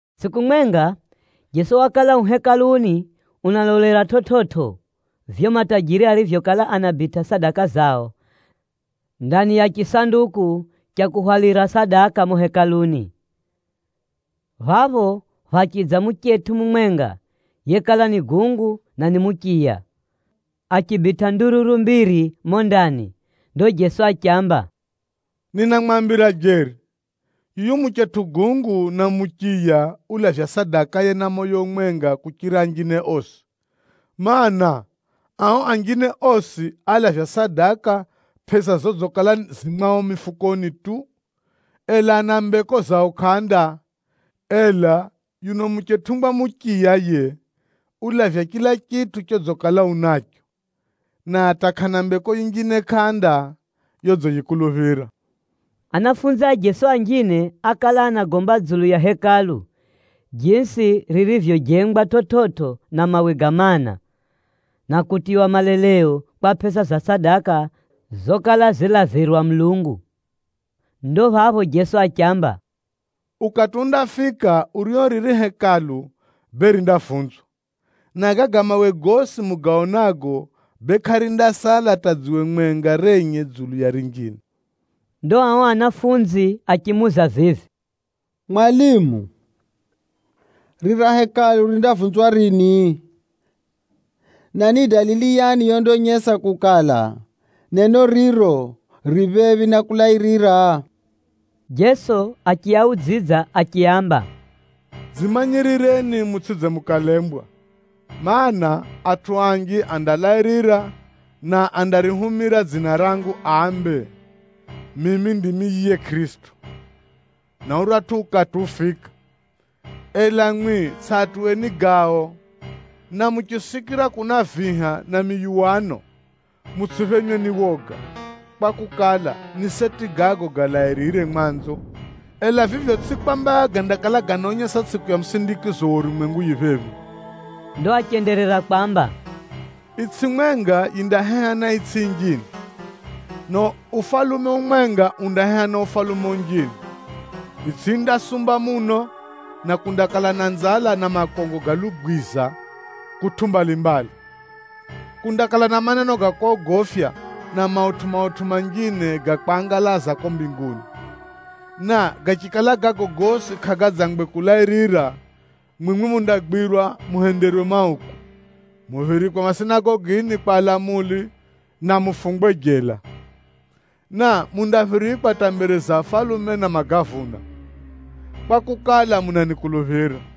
Tsʼiku mwenga, Jeso wakala u Hekaluni unalolera chividzo vivyo matajiri arivyokala anabitʼa sadaka zao ndani ya chisanduku cha kuhwalira sadaka mumo Hekaluni. Phapho phachidza muchetʼu mumwenga yekala ni gungu na ni muchiya, achibitʼa ndururu mbiri mumo ndani. Ndo Jeso achiamba, “Ninamwambira jeri, yuyu muchetʼu gungu na muchiya ulavya sadakaye na moyo umwenga kuchira anjine osi. Maana, ao anjine osi alavya sadaka pʼesa zodzikala zirizo mwao mifukoni tu, ela ana mbeko zao kʼanda. Ela yuno muchetʼungwa muchiya yiye, ulavya chila chitʼu chodzikala unacho, na hata kʼana mbeko yinjine kʼanda yodziyikuluphira.” Anafunzi a Jeso anjine ákala anagomba dzulu ya Hekalu, jisi ririvyojengwa chividzo na mawe ga maana, na kutiywa maleleo kwa pʼesa za sadaka zokala zilavirwa Mulungu. Ndo phapho Jeso achiamba, “Ukati undafika urio riri Hekalu bee, rindavunzwa, na gaga mawe gosi mugaonago bee kʼarindasala hata dziwe mwenga renye dzulu ya rinjine.” Ndo ao anafunzi achimuuza vivi, “Mwalimu, rira Hekalu rindavunzwa rini? Na ni dalili yani yondaonyesa kukala, neno riro ri phephi na kulairira?” Jeso achiaudzidza achiaamba, “Dzimanyirireni mutsʼidze mukalembwa, mana, atʼu anji andalairira na andarihumira dzina rangu ambe, ‘Mimi ndimi yiye Kʼirisito,’ na ‘Uratʼu ukati ufika.’ Ela mwimwi tsʼiatuweni gao! Na muchisikira kuna viha na miyuwano, mutsʼiphenywe ni woga, kwakukala, ni seti gago galairire mwanzo, ela vivyo tsʼivyo kwamba gandakala ganaonyesa tsʼiku ya musindikizo wa urumwengu yifika phephi.” Ndo achenderera kwamba, “Itsʼi mwenga yindaheha na itsʼi yinjine, na ufalume umwenga undaheha na ufalume unjine. Itsʼi yindasumba muno, na kundakala na nzala na makongo ga lugwiza kutʼu mbalimbali. Kundakala na maneno ga kogofya, na mautʼu-mautʼu manjine ga kwangalaza kuko mbinguni. Na gachikala gago gosi kʼagadzangwe kulairira, mwimwi mundagwirwa muhenderwe mauku, muphirikwe masinagogini kwa alamuli na mufungwe jela, na mundaphirikwa hata mbere za afalume na magavuna, kwakukala, munanikuluphira.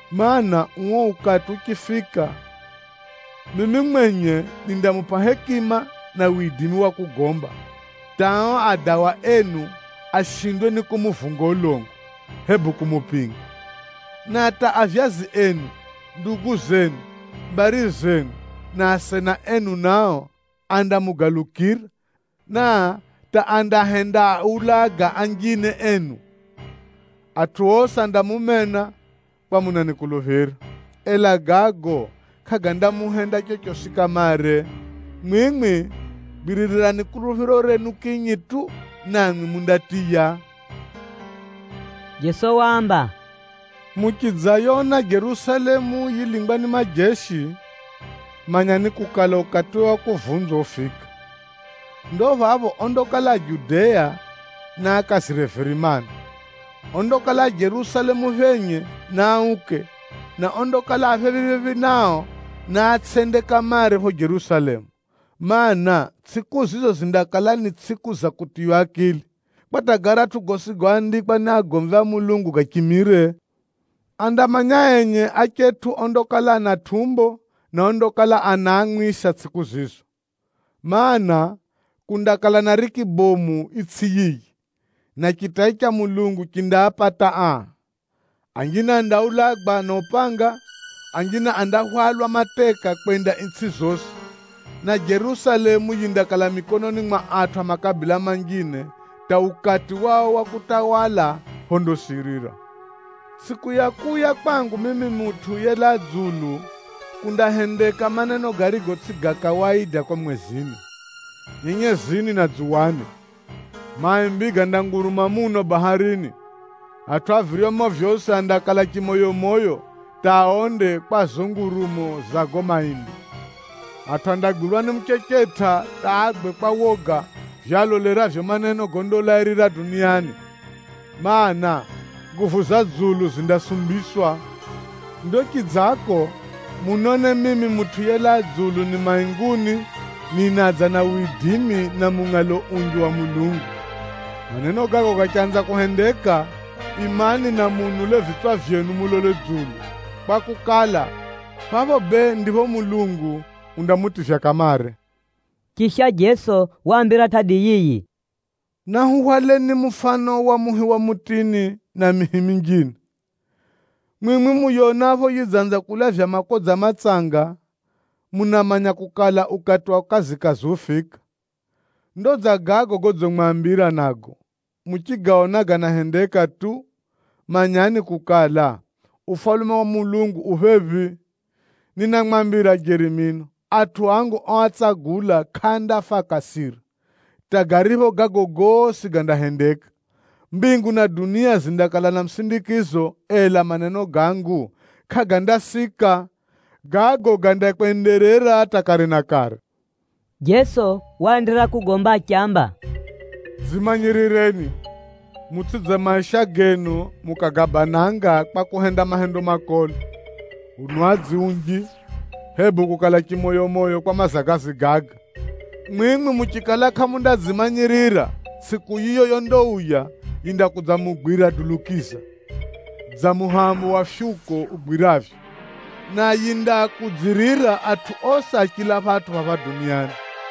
Kwakukala, uo ukati uchifika, mimi mwenye nindamupʼa hekima na widimi wa kugomba hata ao adawa enu ashindwe ni kumuvunga ulongo, hebu kumupinga. Na hata avyazi enu enye, ndugu zenu enye, mbari zenu enye na asena enu enye nao andamugalukira, na hata andahendaaulaga anjine enu. Atʼu osi andamumena, kwakukala munanikuluphira. Ela gago kʼagandamuhenda chochosi kamare. Mwimwi gwiririrani kuluphiro renu kinyi tu, namwi mundatiya.” Jeso waamba, “Muchidzayona Jerusalemu yilingwa ni majeshi, manyani kukala, ukatiwe wa kuvunzwa ufika. Ndo phapho ondakala a Judea, naakazire virimani, ondakala a Jerusalemu phenye, naauke, na ondakala a phephi-phephi nao, naatsʼende kamare phapho Jerusalemu. Maana, tsʼiku zizo zindakala ni tsʼiku za kutiywa akili, kwa hata garatʼu gosi goandikwa ni agomvi a Mulungu gachimire. Andamanya enye achetʼu ondakala ana tʼumbo na ondakala anaamwisa tsʼiku zizo! Maana, kundakala na riki bomu itsʼi yiyi, na chitai cha Mulungu chindaapata aa. Anjine andaulagwa na upanga, anjine andahwalwa mateka kwenda itsʼi zosi, na Jerusalemu yindakala mikononi mwa atʼu a makabila manjine hata ukati wao wa kutawala phondasirira. “Tsʼiku ya kuuya kwangu mimi Mutʼu yelaa dzulu, kundahendeka maneno garigo tsʼigo ga kawaida kuko mwezini, nyenyezini na dzuwani. Maimbi gandanguruma muno baharini, atʼu a viryomo vyosi andakala chimoyomoyo hata aonde kwa zizo ngurumo za gago maimbi. Atʼu andagwirwa ni muchechetʼa hata agwe kwa woga vivyo aloleravyo maneno gondalairira duniani, mana, nguvu za dzulu zindasumbiswa. Ndo chidzako, munone mimi Mutʼu yelaa dzulu ni mainguni ninadza na widimi na mungʼalo unji wa Mulungu. Maneno gago gachanza kuhendeka, imani na muunule vitswa vyenu mulole dzulu, kwakukala, phapho bee ndipho Mulungu undamutivya kamare.” Chisha Jeso waambira tʼadi yiyi, “Nahuhwaleni mufano wa muhi wa mutini na mihi minjine. Mwimwi muyonapho yidzanza kulavya makodza matsanga, munamanya kukala, ukati wa kazikazi ufika. Ndo dza gago godzimwambira nago. Muchigaona ganahendeka tu, manyani kukala, Ufalume wa Mulungu u phephi. Ninamwambira jeri mino, atʼu angu oatsagula kʼaandafa akasira, hata garipho gago gosi gandahendeka. Mbingu na dunia zindakala na musindikizo, ela maneno gangu kʼagandasika. Gago gandakwenderera hata kare na kare.” Jeso waenderera kugomba achiamba, “Dzimanyirireni, mutsʼidze maisha genu mukagabananga kwa kuhenda mahendo makolo, unwadzi unji, hebu kukala chimoyomoyo kwa mazagazi gaga. Mwimwi muchikala kʼamundadzimanyirira, tsʼiku yiyo yondauya yindakudzamugwira dulukiza dza muhego wa fyuko ugwiravyo, na yindaakudzirira atʼu osi a chila phatʼu phapha duniani.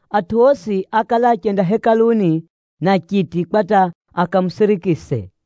Atʼu osi ákala achenda Hekaluni na chiti kwa hata akamusirikise.